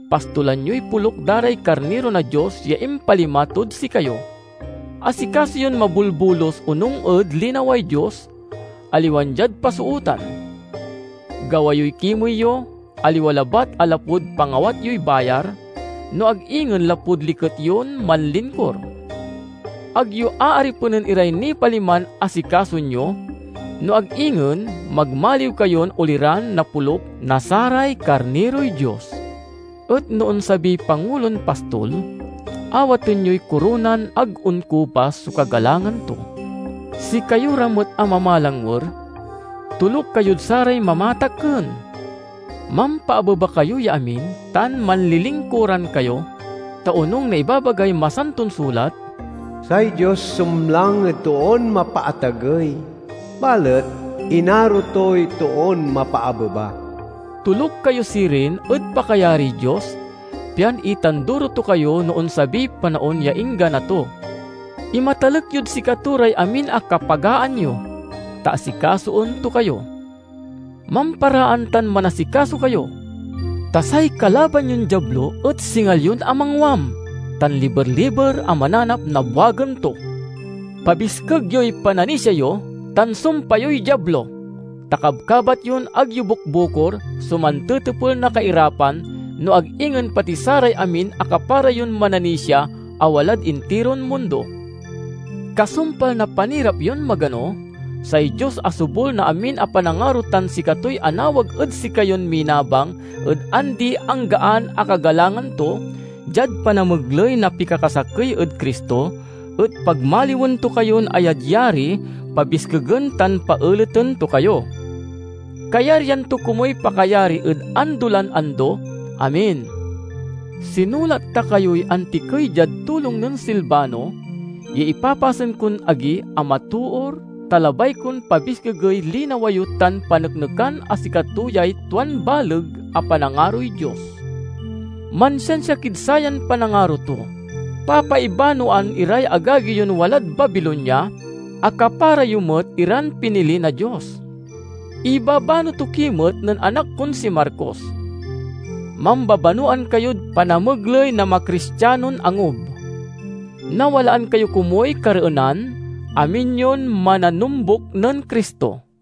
pastolan yoy poluk da ray karniro na Dios ya impalima tod sikayo. Asikaso yon mabolbolus onung ed linaway Dios, aliwan diad pasootan. Gawa yoy kimey yo, aliwa labat a lapud pangawat yoy bayar, no ag ingen lapud liket yon manlingkur. Ag yo aaripenen iray nipaliman asikasoen yo, no ag ingen magmaliw kayon oliran na poluk na saray karniroy Dios. Et no onsabiy Pangulon Pastol, awaten yoy koronan ag onkupas so kagalangan to. Sikayo ra met a mamalangwer, toluk kayod saray mamatakken. Mampaabeba kayo ya amin tan manlilingkuran kayo, ta onung na ibabagay Masanton Sulat, "Say Dios sumlang ed toon mapaatagey, balet inaro toy toon mapaabeba." Toluk kayo sirin ed pakayariy Dios, pian itanduro to kayo no onsabiy panaon ya inggana to. Imatalek yod sikato ray amin a kapagaan yo, ta asikasoen to kayo. Mamparaan tan manasikaso kayo! Ta say kalaban yon Diablo et singa lion a mangwam tan liber-liber a mananap na buagen to. Pabiskeg yoy pananisia yo, tan sumpa yoy Diablo, ta kabkabat yon ag yo bukbukor so mantetepel na kairapan, no ag ingen pati saray amin a kapara yon mananisia a walad intiron mundo. Kasumpal na panirap yon magano, say Dios a sobul na amin a panangaro tan sikatoy anawag ed sikayon minabang ed andi-anggaan a kagalangan to, diad panamegley na pikakasakey ed Cristo, et pagmaliwen to kayon ayadyari, pabiskegen, tan paeleten to kayo. Kayaryan to komuy pakayari ed ando lan ando! Amen. Sinulat ta kayoy antikey diad tulong nen Silvano, ya ipapasen kon agi a matoor, ta labay kon pabiskegey linawa yo tan paneknekan a sikato yay tuan baleg a panangaroy Dios. Mansiansia kid sayan panangaro to. Papaibanoan iray agagi yon walad Babilonia, a kapara yo met iran pinili na Dios. Ibabano to ki met nen anak kon si Marcos. Mambabanowan kayod panamegley na macristianon angub. Nawalaan kayo komuy kareenan, amin yon mananombuk nen Cristo.